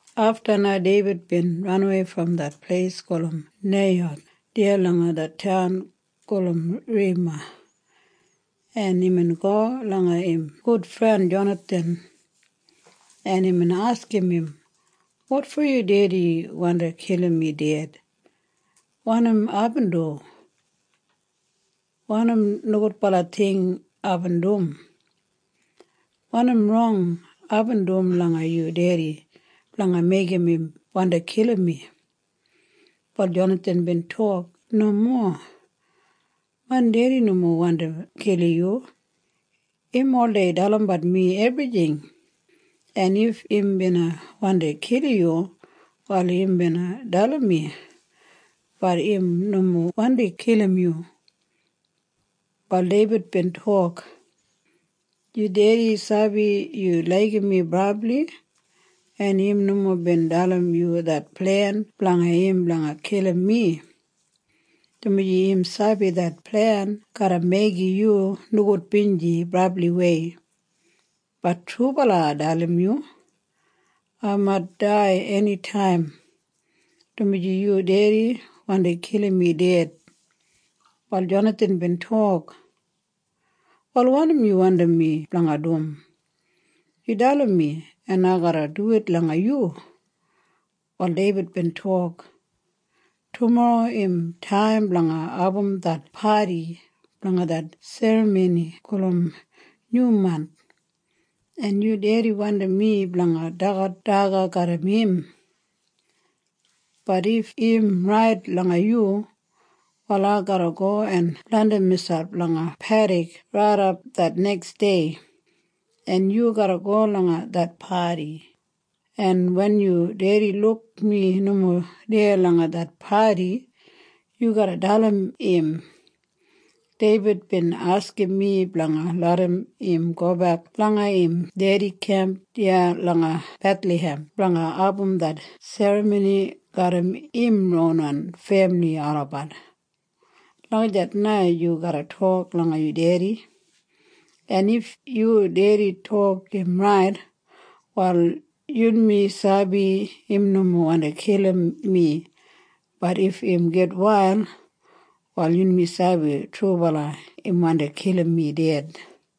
Afta na Deibid bin ranawei brom det pleis gulum Naiyoth deya langa det taun gulum Rema, en imbin go langa im gudfren Jonathan, en imbin askim im, “Wotfo yu dedi wandi kilim mi ded? Wanim aibin du? Wanim nogudbala ting aibin dum? Wanim rong aibin dum langa yu dedi blanga meigim im wandi kilim mi?” Wal Jonathan bin tok, “Nomo. Main dedi nomo wandi kilim yu. Im oldei dalimbat mi ebrijing, en if im bina wandi kilim yu, wal im bina dalim mi. Bat im nomo wandi kilim yu.” Wal Deibid bin tok, “Yu dedi sabi yu laigim mi brabli, en im nomo bin dalim yu det plen blanga im blanga kilim mi, dumaji im sabi det plen garra meigim yu nogudbinji brabliwei. Bat trubala ai dalim yu. Ai mait dai enitaim, dumaji yu dedi wandi kilim mi ded.” Wal Jonathan bin tok, “Wal wanim yu wandim mi blanga dum? Yu dalim mi, en ai garra duwit langa yu.” Wal Deibid bin tok, “Tumorro im taim blanga abum det padi blanga det serramoni gulum Nyumanth, en yu dedi wandim mi blanga dagat daga garram im. Bat if im rait langa yu, wal ai garra go en blandim miselp langa pedik raidap det neksdei, en yu garra go langa det padi, en wen yu dedi luk mi nomo deya langa det padi, yu garra dalim im, ‘Deibid bin askim mi blanga larram im gobek langa im dedi kemp deya langa Bethlahem blanga abum det serramoni garram im ronwan femili olabat.’ Lagijat na yu garra tok langa yu dedi, en if yu dedi tok im rait, wal yunmi sabi im nomo wandi kilim mi. Bat if im gitwail, wal yunmi sabi trubala im wandi kilim mi ded.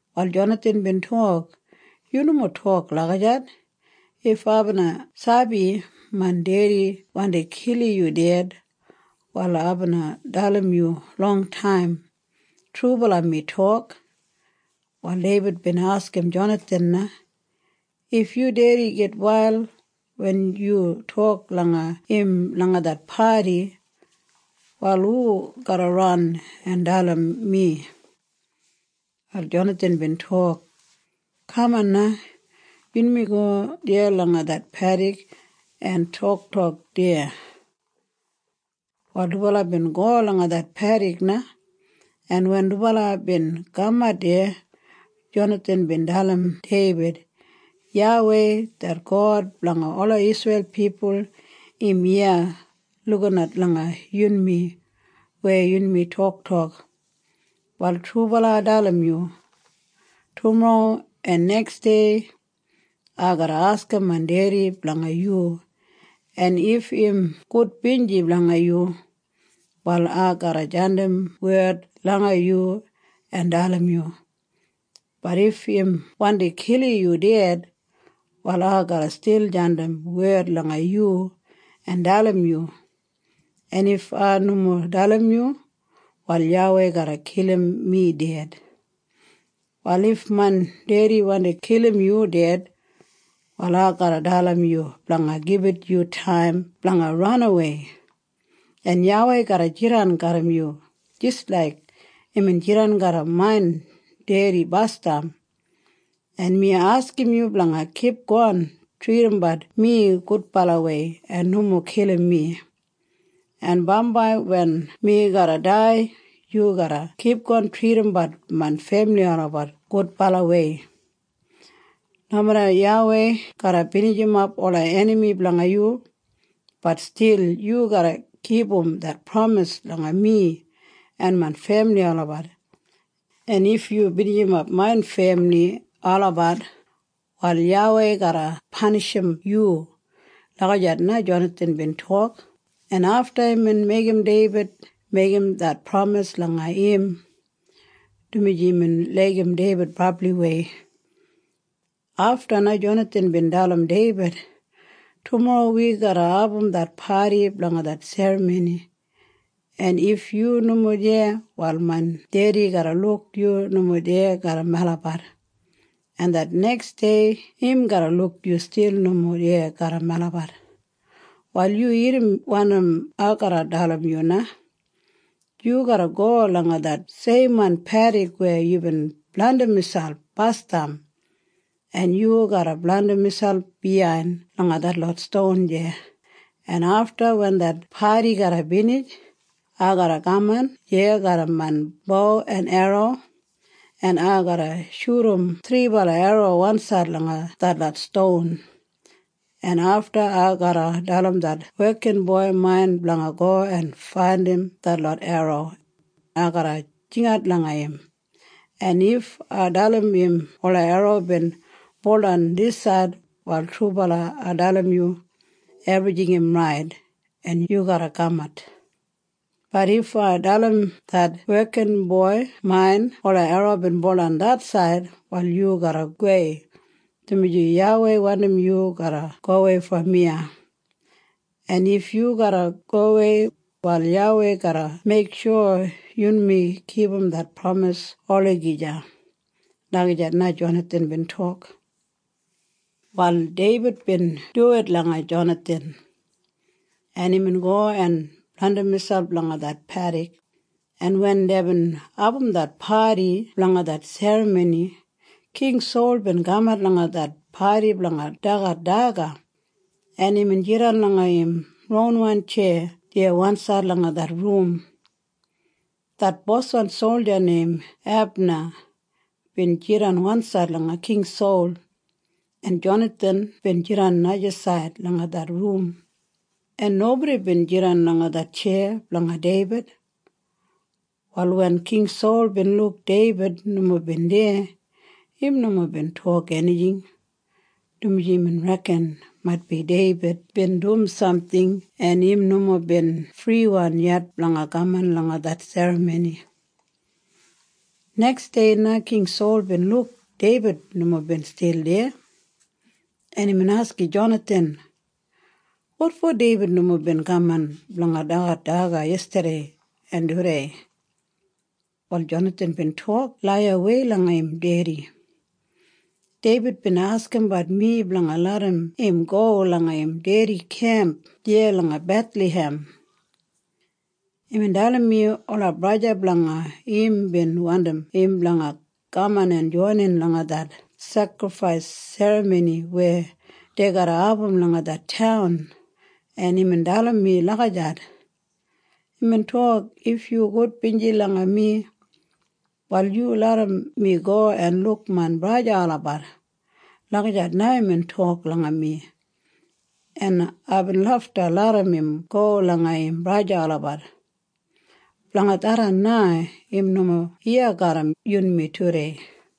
Wal Jonathan bin tok, “Yu nomo tok lagijat! If ai bina sabi main dedi wandi kilim yu ded, wal ai bina dalim yu longtaim. Trubala mi tok.” Wal Deibid bin askim Jonathan na, “If yu dedi gitwail wen yu tok langa im langa det padi, wal hu garra ran en dalim mi?” Wal Jonathan bin tok, “Kaman na. Yunmi go deya langa det pedik en toktok deya.” Wal dubala bin go langa det pedik na, en wen dubala bin kamat deya, Jonathan bin dalim Deibid, “YAWEI det God blanga ola Isreil pipul im iya lukinat langa yunmi weya yunmi toktok. Wal trubala ai dalim yu. Tumorro en neksdei ai garra askim main dedi blanga yu, en if im gudbinji blanga yu, wal ai garra jandim wed langa yu en dalim yu. Bat if im wandi kilim yu ded, wal ai garra stil jandim wed langa yu en dalim yu. En if ai nomo dalim yu, wal YAWEI garra kilim mi ded. “Wal if main dedi wandi kilim yu ded, wal ai garra dalim yu blanga gibit yu taim blanga ranawei, en YAWEI garra jidan garram yu jis laik imbin jidan garram main dedi basdam, en mi askim yu blanga kipgon tridimbat mi gudbalawei en nomo kilim mi, en bambai wen mi garra dai, yu garra kipgon tridimbat main femili olabat gudbalawei. Nomeda YAWEI garra binijimap ola enami blanga yu, bat stil yu garra kipum det pramis langa mi en main femili olabat. En if yu binijimap main femili olabat, wal YAWEI garra panishim yu.” Lagijat na Jonathan bin tok, en afta imbin meigim Deibid meigim det pramis langa im, dumaji imbin laigim Deibid brabliwei. Afta na Jonathan bin dalim Deibid, “Tumorro wi garra abum det padi blanga det serramoni, en if yu nomo deya, wal main dedi garra luk yu nomo deya garram melabat, en det neksdei im garra luk yu stil nomo deya garram melabat. “Wal yu irrim wanim ai garra dalim yu na. Yu garra go langa det seimwan pedik weya yubin blandim miselp basdam, en yu garra blandim miselp biyain langa detlot ston deya, en afta wen det padi garra binij, ai garra kaman deya garram main bo en erro, en ai garra shudum thribala erro wansaid langa detlot ston, en afta ai garra dalim det wekinboi main blanga go en faindim detlot erro. Ai garra jingat langa im, en if ai dalim im ola erro bin buldan disaid, wal trubala ai dalim yu, ebrijing im rait, en yu garra kamat. Bat if ai dalim det wekinboi main ola erro bin buldan det said, wal yu garra gowei, dumaji YAWEI wandim yu garra gowei brom iya, en if yu garra gowei, wal YAWEI garra meiksho yunmi kipum det pramis olagija.” Lagijat na Jonathan bin tok. Wal Deibid bin duwit langa Jonathan, en imbin go en blandim miselp langa det pedik, en wen deibin abum det padi blanga det serramoni, King Sol bin kamat langa det padi blanga dagat daga, en imbin jidan langa im ronwan tjeya deya wansaid langa det rum. Det boswan solja neim Ebna bin jidan wansaid langa King Sol, en Jonathan bin jidan najasaid langa det rum, en nobodi bin jidan langa det tjeya blanga Deibid. Wal wen King Sol bin luk Deibid nomo bin deya, im nomo bin tok enijing, dumaji imbin reken maitbi Deibid bin dum samting en im nomo bin friwan yet blanga kaman langa det serramoni. Neksdei na King Sol bin luk Deibid nomo bin stil deya, en imbin askim Jonathan, “Wotfo Deibid nomo bin kaman blanga dagat daga yestadei en tudei?” Wal Jonathan bin tok laiyawei langa im dedi, “Deibid bin askimbat mi blanga larram im go langa im dedi kemp deya langa Bethlahem. Imbin dalim mi ola braja blanga im bin wandim im blanga kaman en joinin langa det sekrifais serramoni weya dei garra abum langa det taun, en imbin dalim mi lagijat. Imbin tok, ‘If yu gudbinji langa mi, wal yu larram mi go en luk main braja olabat.’ Lagijat na imbin tok langa mi, en aibin lafta larram im go langa im braja olabat. Blanga tharran na im nomo iya garram yunmi tudei.”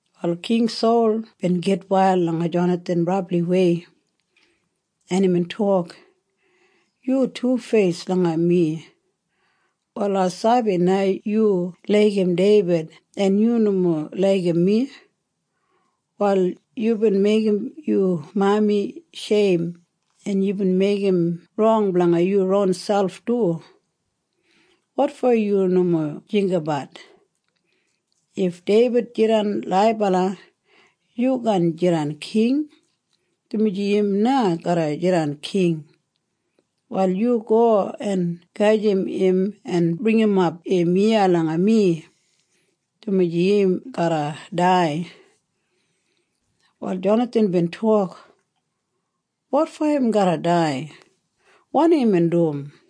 Wal King Sol bin gitwail langa Jonathan brabliwei, en imbin tok, “Yu tufeis langa mi! Wal ai sabi na yu laigim Deibid en yu nomo laigim mi. Wal yubin meigim yu mami sheim, en yubin meigim rong blanga yu ronselp du. Wotfo yu nomo jinggabat? If Deibid jidan laibala, yu kaan jidan king, dumaji im na garra jidan king. Wal yu go en gajim im en bringimap im iya langa mi, dumaji im garra dai.” Wal Jonathan bin tok, “Wotfo im garra dai? Wanim imbin dum?”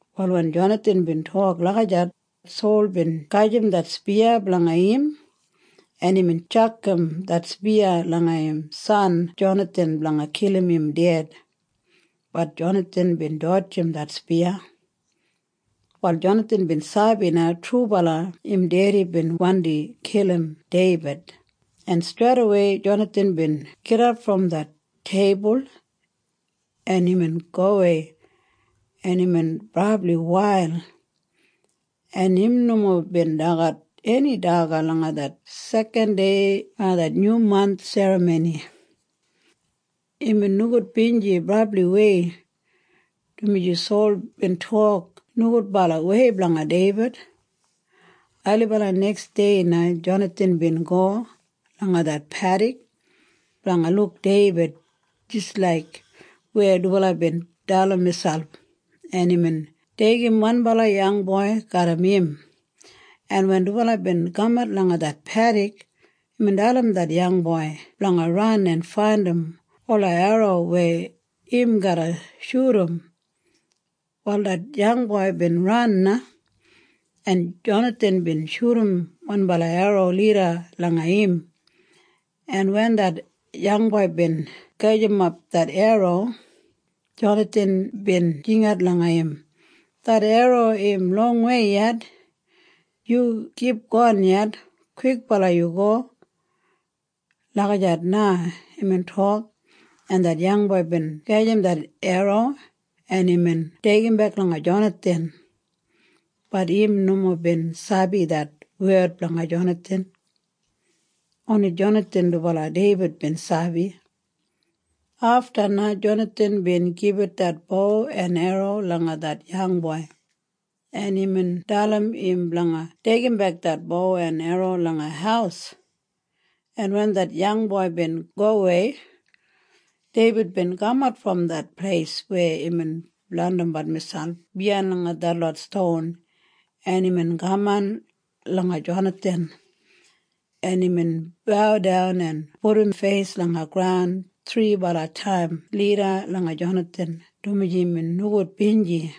Wal wen Jonathan bin tok lagijat, Sol bin gajim det spiya blanga im, en imbin tjakam det spiya langa im san Jonathan blanga kilim im ded. Bat Jonathan bin dodjim det spiya. Wal Jonathan bin sabi na trubala im dedi bin wandi kilim Deibid, en streidawei Jonathan bin gidap brom det teibul, en imbin gowei, en imbin brabli wail, en im nomo bin dagat eni daga langa det sekan dei blanga det Nyumanth serramoni. Imbin nogudbinji brabliwei, dumaji Sol bin tok nogudbalawei blanga Deibid. Ailibala neksdei na Jonathan bin go langa det pedik blanga luk Deibid jis laik weya dubala bin dalim miselp, en imbin deigim wanbala yangboi garram im, en wen dubala bin kamat langa det pedik, imbin dalim det yangboi blanga ran en faindim ola erro weya im garra shudum. Wal det yangboi bin ran na, en Jonathan bin shudum wanbala erro lida langa im, en wen det yangboi bin gajimap det erro, Jonathan bin jingat langa im, “Det erro im longwei yet. Yu kipgon yet. Kwikbala yu go.” Lagijat na imbin tok, en det yangboi bin gajim det erro, en imbin deigimbek langa Jonathan. Bat im nomo bin sabi det wed blanga Jonathan. Oni Jonathan dubala Deibid bin sabi. Afta na Jonathan bin gibit det bo en erro langa det yangboi, en imbin dalim im blanga deigimbek det bo en erro langa haus, en wen det yangboi bin gowei, Deibid bin kamat brom det pleis weya imbin blandimbat miselp biyain langa detlot ston, en imbin kaman langa Jonathan, en imbin baudan en pudum feis langa graun thribala taim lida langa Jonathan dumaji imbin nogudbinji,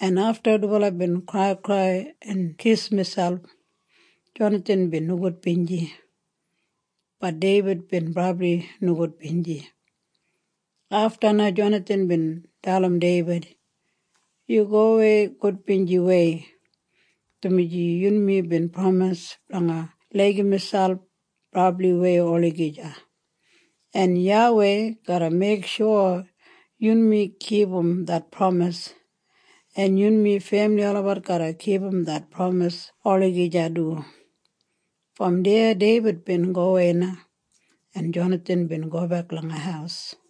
en afta dubala bin kraikrai en kis miselp. Jonathan bin nogudbinji. Bat Deibid bin brabli nogudbinji. Afta na Jonathan bin dalim Deibid, “Yu gowei gudbinjiwei, dumaji yunmi bin pramis blanga laigim miselp brabliwei olagija, en YAWEI garra meiksho yunmi kipum det pramis, en yunmi femili olabat garra kipum det pramis olagija du.” Brom deya Deibid bin gowei na, en Jonathan bin gobek langa haus.